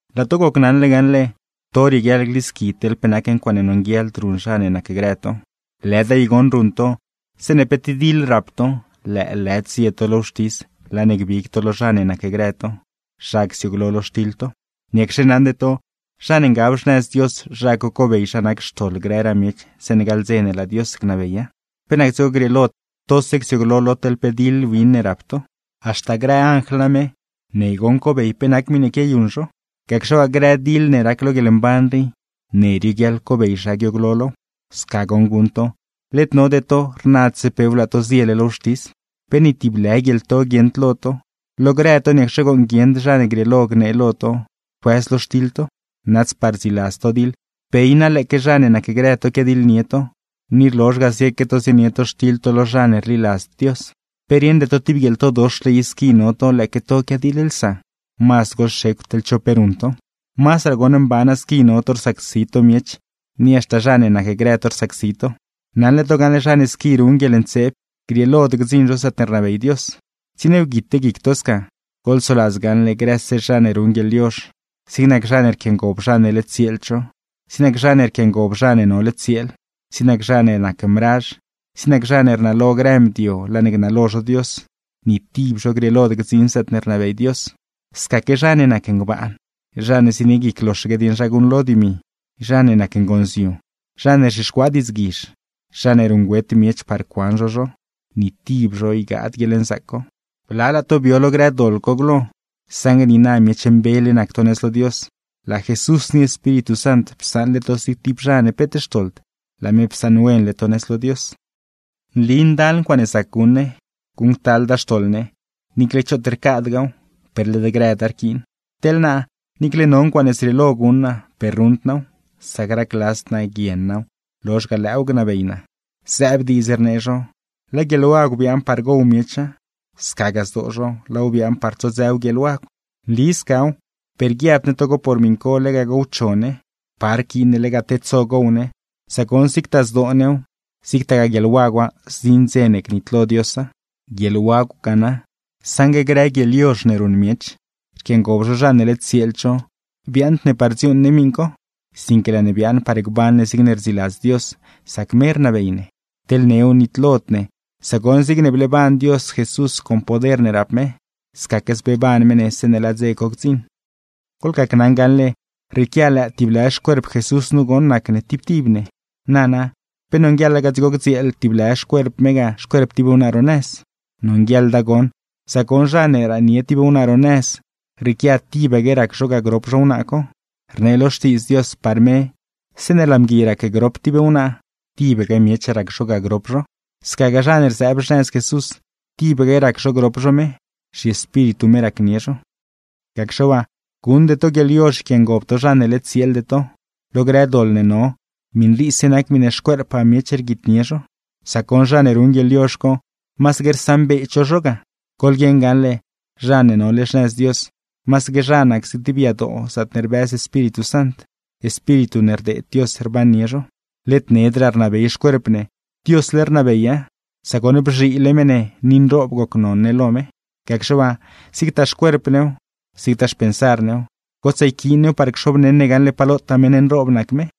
Laa to gocnaṉle gaṉle, to rieguiaḻ glisqui teḻ pe nac ncuaaṉe nonguieḻd ruṉ zha ne nacgrë to. Lëda i goṉ ruṉ to, zeeṉe pe tib diḻ rap to, lëëlëd zie to lo wxtis laa ne gbig to lo zha ne nacgrë to, zha csiooglo lo xtiḻ to. ¿Niacxe naṉde to zha ne ngab xnëz Dios, zha co cobey zha nac xtoḻ grëraa miech zeeṉe gaḻ dze ne laa Dios gnabeya? ¿Pe nac dzigo grieelod tose csiooglo lo teḻ pe diḻ win ne rap to? Haxta grë anjl name, ne goṉ cobey pe nac grë miṉe quiayuṉ zho. Gacxe waa, grë diḻ ne rac lo guieḻmban rii, ne rioguiaḻ cobey zha guiooglo low. Sca goṉ guṉ to, led node to, rnadse pew laa to ziele lo wxtis. ¿Pe ni tib lë guieḻto guieṉd lo to? Lo grë to, ¿niacxe gooṉ guieṉd zha ne grieelo gnee lo to, cuëz lo xtiḻ to? Nazdpaa rdziladz to diḻ, ¿pe i na lëëque zha ne nacgrë to quiadiḻnie to, ni rlozh ga zieque to zienie to xtiḻ to lo zha ne rliladzd Dios? Pe rieṉde to tib guieḻtodoxle i squi no to lëëque to quiadiḻlsa. Mazd goḻxecw teḻ cho pe ruṉ to. Mazdraa goṉ mbana squi no to rsacsi to miech, ni haxta zha ne nacgrë to rsacsi to. Naṉle to gaṉle zha ne squi ruṉ guieḻntseeb, grieelod gdziṉ zho zaatne rnabey Dios. Tsieniewguite guic to sca. Goḻsoladz gaṉle grëse zha ne ruṉ guieḻyozh: zig nac zha ne rquiangob zha ne led tsieeld zho, zig nac zha ne rquiangob zha ne nole tsieel, zig nac zha ne nac mrazh, zig nac zha ne rnalo grë mdio laa ne gnalo zho Dios, ni tib zho grieelod gdziṉ zaatne rnabey Dios. Scaque: zha ne nac ngbaan, zha ne zienie guic loxaque dieṉ zha guṉlo dimi, zha ne nac ngonziu, zha ne rzhixcuaa diidzguizh, zha ne ruṉgüet miech par cuan zho zho; ni tib zho ygaad guieḻnzaac co. Blalaa to bio lo grë doḻ co glo, saṉgue niina miech mbele nac to nëz lo Dios, laa Jesús ni Espíritu Sant psaṉle to zig tib zha ne peet xtoḻd, laa me psaṉwenle to nëz lo Dios. Nli ndal ncuaaṉe zac guṉ ne, guṉctalda xtoḻ ne, niicle choot rcadgaaw, per led grëda rquiin. Teḻ naa, niicle no ncuaaṉe zrieelo guṉ naa, per ruṉd naaw; sac racladzd naa guien naaw, lozh ga lëëw gnabey naa. Zëëb diidz rnee zho: “Laa guieḻwagw biaaṉ par gow miecha, scagaa zdoo zho laaw biaaṉ par tsodzëw guieḻwagw.” Nli scaw, per guiabd ne togo por miṉ co lega gowcho ne. Pa rquiin ne lega tedso gow ne, sac goṉ zigtaa zdoo new, zigtagaa guieḻwagwa, zdziṉ dze ne gnitlo Diosa. Guieḻwagw ga na, saṉgue grë guieḻyozh neruṉ miech rquiangob zho zha ne led tsieeld zho, biaaṉd ne par dziuuṉ ne miṉ co, sinque laa ne biaaṉ par gban ne zigne rdziladz Dios, sac me rnabey ne. Teḻ new nitlod ne, sac goṉ zigne bleeban Dios Jesús con poder ne rap me, scaque zbeeban me ne zeeṉe laa dze co gdziṉ. Goḻgacnaṉ gaṉle, rrieequia lëë tiblë xcuerp Jesús nu goṉ nac ne tib tib ne. Nana, ¿pe nonguieḻa ga dzigo gdzieel tib lë xcuerp me ga xcuerp tib wnaa ro nëz? ¡Nonguieḻda goṉ! Sac goṉ zha ne raanie tib wnaa ro nëz, rrieequia tibaque rac zho ga grop zho wnaa co. Rnee lo Xtiidz Dios, par me: “Zeeṉe laa mgui racgrop tib wnaa, tibaque miech rac zho ga grop zho.” Scagaa zha ne rzëëb xnëz Jesús, tibaque rac zho grop zho me, zhiEspíritu me racnie zho. Gacxe waa, guṉde to guieḻyozh yquiangob to zha ne led tsieelde to. Lo grë doḻ ne no, miṉ riise nac miṉe xcuerppaa miech rguitnie zho. Sac goṉ zha ne ruṉ guieḻyozh co, masaque rsaṉbeed zho zho ga. Goḻguieṉ gaṉle, zha ne nole xnëz Dios, masaque zha nac zig tib yadoo zaatne rbëz Espíritu Sant, Espíritu ne rdeed Dios rbannie zho. Led nedraa rnabey xcuerp ne, Diosle rnabeya, sac goṉ bzhiile me ne ni nroob gocnon ne lo me. Gacxe waa, zigtaa xcuerp new, zigtaa xpensar new, gotsaa yquiin new par cxobneṉ ne gaṉle pa lotaa meṉ nroob nac me.